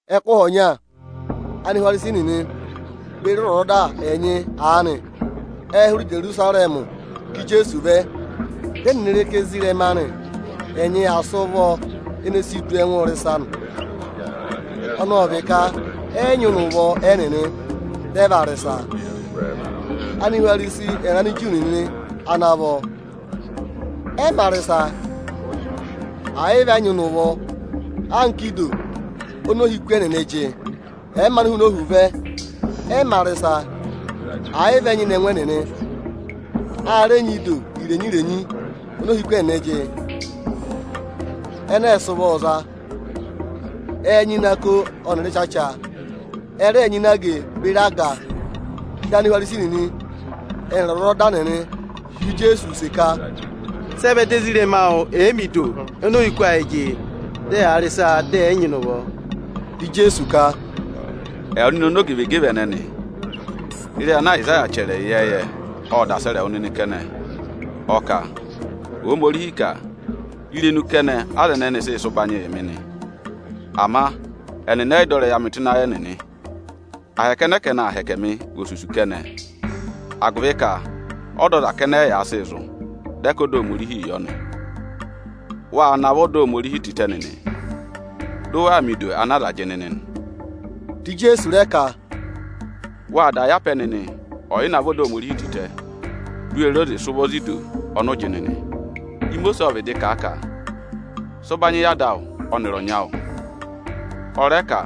Ẹkụhị ọnya Anihwarisi nịnị beri ọzwọzọda ẹnyị aanị ệ hụrẹ Ijerusarẹmị ká Ijeesu vẹ. Dị ẹnịnị re ka ezirẹma anị ẹnyị aa sị ụvọ ịdọtịị rị ịsa nị, ọnọọ vị ka ẹ yị nyịna ụvọ ẹnịnị, dị ẹ vaa rị ịsa. Anihwarisi ẹnịrị Aniju nịnị ana vọ, ẹ mā rị ịsa, ẹ̀ yị vị ẹ nyịna ụvọ anka ido oni ohiku ẹnịnị jị. Ẹ̀ẹ maanị hụụnị ohu vẹ, ẹ mā rị ịsa, ẹ̀ yị vị ẹ nyịna ẹngụ ẹnịnị. A rẹ nyị ido irenyi-irenyi oni ohiku ẹnịnị jị, ẹnẹ ẹ sị ụvọọ za; ẹẹ̄ nyịna ako ọnịrị ịchacha, ẹ rẹẹ̄ nyịna age beri aga. Dị Anihwarisi nịnị ẹnịrị ọzwọzọda nịnị họ̀ Ijeesu use ka, “Sị ẹ vẹ dị ezirẹma awụ ẹ̀ yị mẹ ido oni ohiku ayị jị, dị ẹyaa rị ịsa dị ẹ̀ yị nyịna ụvọ?” Dị Ijeesu ka, “Ẹwụ nịnị ọmọzakụyẹ ẹnẹnị! Ịrẹyị ana Ayịsaya chẹrẹ ịyẹẹyẹ, ộ da sẹrẹ wụ nịnị kẹnẹ, ọ ka: ‘Ohomorihi ka: Irenu kẹnẹ aza ẹnẹnị sị sị ụbanyị yị mị nị; ama ẹnịnị ẹ yị dọ ịrẹyị amị tụ́ ịnị ayị ẹnịnị. Ahẹkẹ ẹnẹẹ ka ẹnị aa hẹkẹ mị, vị osusu kẹnẹ, agụvị ka ọda aza kẹnẹ ẹ́ yaa sịị zụ̀, dị ẹ ka ọda Ohomorihii yọ nị.’ Wâ navọ ọda Ohomorihi tịtẹ nịnị, dị ụ waa mẹ ido ana aza jị nịnị nị.” Dị Ijeesu rẹ ka, “Wâ da yara mẹ apẹ nịnị ọyịnavọ ọda Ohomorihi tịtẹ, di u we re oze sị ụvọ za ido ọnị ụ jị nịnị! Imosiisi ộ vịdị kà a ka: ‘Sị ụbanyị yị ada awụ ọnịrị ọnyị awụ!’ Ọ rẹ ka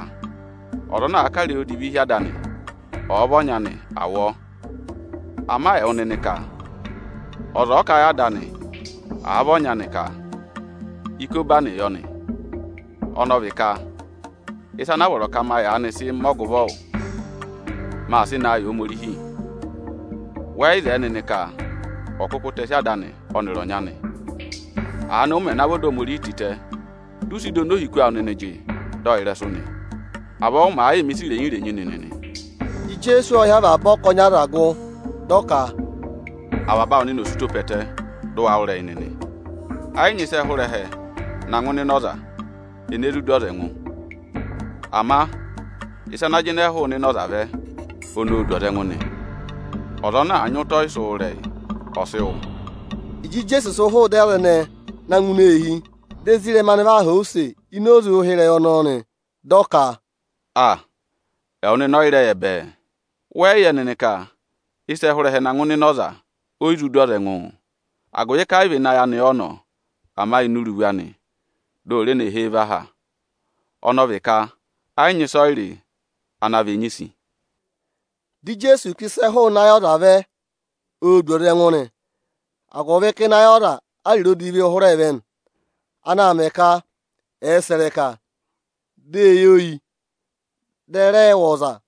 ọza ana àa kà ịrẹyị odivi hi ada anị, ọ̀ọ vị ọnyị anị, à wụ ọọ! Ama ẹwụ nịnị ka: Ọza ọ̀ọ kà a yị ada anị, àa vị ọnyị anị ka: ‘Ikobani yọ nị’, ọnọọ vị ka ịsa ana vọrọ ka ma yaanị sị mẹ ọgụvọ wụ, maa sị naa yị Ohomorihi; wẹ yị zẹẹ nịnị ka ọ̀ kụkụ tẹsị ada anị ọnịrị ọnyị anị. Aanị ụ mẹ̀ navọ ọda Ohomorihi tịtẹ, dị ụ sị ido oni ohiku awụ nịnị jị, dọ ọ ịrẹsụ nị. Avọọ ụ màa yịị mẹ̀ ịsa irenyi-irenyi nịnị nị.” Ijeesu ộ hị́ avaba ọkọnị aza gụ, dị ọ ka, “Avaba awụ nịnị ọ̀ sị ụtọ pe ẹtẹ, dị ụ wa wụ́ ịrẹyị nịnị! Ẹ yị nyị ịsị ẹ hụrẹ ẹhẹ na ngụ ịnị ịnẹ ọza, ene zụ du ọza ẹngụ. Ama ịsa ana jịnẹ hụụnị ịnẹ ọza vẹ, oni oō du ọza ẹngụ nị. [Ọza ana àa nyị ụtọ ọyịsị wụ́ ịrẹyị, ọ̀ sị wụ́!”] Ịjị Ijeesu sị hụụ ịdị aza ẹnẹ na ngụ ini eehi, di ezirẹma anị va họ̀ ọ use ini oze ụhịrẹyị ọnọọ nị. Dị ọ ka, “Aa, ẹwụ nịnị ọ yị rẹ yẹ bẹẹẹ? Wẹ yị yẹ nịnị ka ịsị ẹ̀ẹ hụrẹ ẹhẹ na ngụ ịnị ịnẹ ọza, o yi zụ du ọza ẹngụụ. Agụvị ka ẹ yị vị ịnị ayị anị ọ nọ, ama ini iruvu anị, di o re ne he e và ha, ọnọọ vị ka ẹ yị nyị ịsọyịrị ana vị enyisi.” Dị Ijeesu ka ịsị ẹ̀ẹ hụụnị ayị ọza vẹ, oō du ọza ẹngụ nị; agụvị ka ịnị ayị aza áriro odiviī hụrẹẹ vẹ nị, anaā mẹ ka ẹ̀ẹ sẹ̀ ịrẹka, di èe yi oyi, dị ẹ̀ẹ rẹẹ wụ̀ ọza,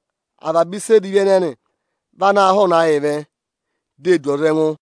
Avaba ịsa edivi ẹnẹnị vị anaā hụụnị ayịị vẹ, di e du ọza ẹngụ.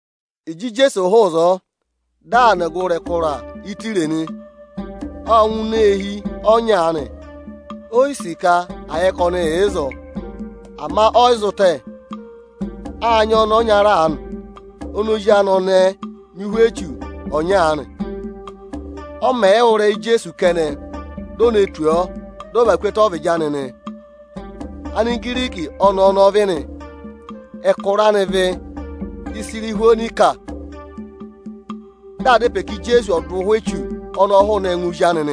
Ịjị Ijeesu hụụ ịzọọ, dị aa nọ ọgụrị ẹkụra Ịtaya nị. Ộ ngụ ini eehi ọnya aanị, o yi sì ka à yẹ ka ọnị yà ịzọọ; ama ọ yị zụ tẹ. Â nyị ọnẹẹ ọnyara aanị oni ozi anị ọnẹẹ nyị ụhwẹ echu ọnya aanị. Ọ mẹ̀ yị wụ́ ịrẹyị Ijeesu kẹnẹ, di o ne tù ọọ, dị ọ và ku ẹtẹ ọ́vịdị anị nị. Ọnẹẹ ọnọọ vị Anigiriki; Anihwonesiya ịnị ẹtẹ Isiriya ọ vị nị. Ộ dá ịpẹ yị Ijeesu ka ọ̀ dụ ụhwẹ echu ọnọọ hụụnị ẹngụ ozi anị.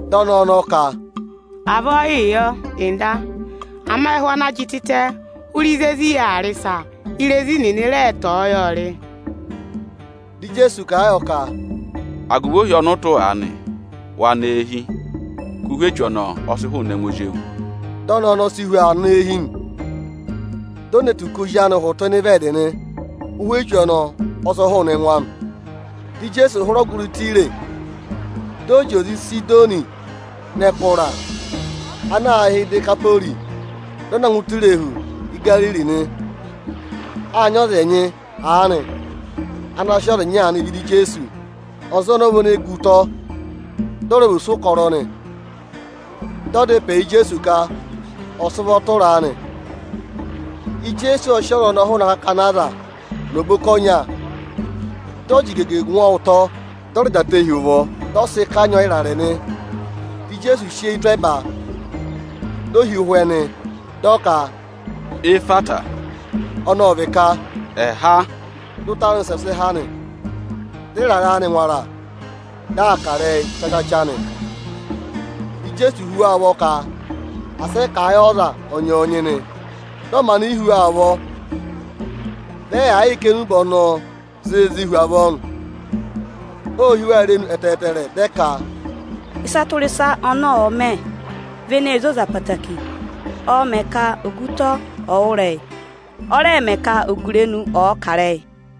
Dị ọnẹẹ ọnọọ ka, “Avọọ yịị yọ, Nda; ama ẹhụ ana jị tịtẹ hụụ ịzị ezi yà aa rị ịsa, irezi nịnịị̄ rẹ tọ̀ọ́ yọọ rị.” Dị Ijeesu kà a yọ ka, “Agụvị ohi ọnị ụ tụ́ aanị, wa nọ eehi, ka ụhwẹ echu ọnọọ ọ sị hụụnị ẹngụ ozi ewu.” Dị ọnẹẹ ọnọọ si hu aa nọ eehi nị. Di o ne tù ka ozi anị hụtụ ịnị ịvẹẹdị nị; ụhwẹ echu ọnọọ ọ sị hụụnị ẹngụ anị. Dị Ijeesu hụrẹ ọgụrị Ịtaya, dị ọ zị oze Ịsịdọnị nọ ẹkụra ana aā hị́ Idekapori, dị ọ na ngụ ụtọ irehu Igariri nị. Â nyị aza ẹnyị aanị ana sị ọza ịnya aanị vẹ ịdị Ijeesu. Ọza ọnọọ vị ene gu ụtọ, dị ọ rẹ vị ọsụkọrọ nị. Dị ẹ dá ịpẹ yị Ijeesu ka ọ̀ sị ụvọ tụra a nị; Ijeesu ộ sị ọza ọnọọ hụụnị akakana aza nọ oboka ọnya. Dị ọ jị igege ngwọ ọ ụtọ, dị ọ rẹ jị atẹ hi ụvọ, dị ọ sị kanyị ọọ ịrarẹ nị; Dị Ijeesu sị eyi tụ́ ẹba, di o hi ụhwẹ zẹtẹ, dị ọ ka, “Ehwata”, ọnọọ vị ka, “Há!” Dị ụtọ anị wụsẹ há nị, dị ịrarẹ anị ngwara, dị aa kà ịrẹyị chachacha nị. Dị Ijeesu hú wa ụvọ ka asị ẹ kà a yị ọza ọnyọọnyị nị. Dị ọ maanị yi hú wa ụvọ, vị ẹ yaa yịị kà enube ọnọọ zịịzị hu avọọ nị. Ô hí wa irenu ẹtẹẹtẹrẹ, dị ẹ ka, “Ịsa tụra ịsa ọnị ọ̀ọ mẹ vị eneē zoza ẹtẹẹtẹrẹ. Ộ mẹ ka ogutọ ọ̀ọ wụ́ ịrẹyị, ọ rẹ mẹ ka ogurenu ọ̀ọ kà ịrẹyị.”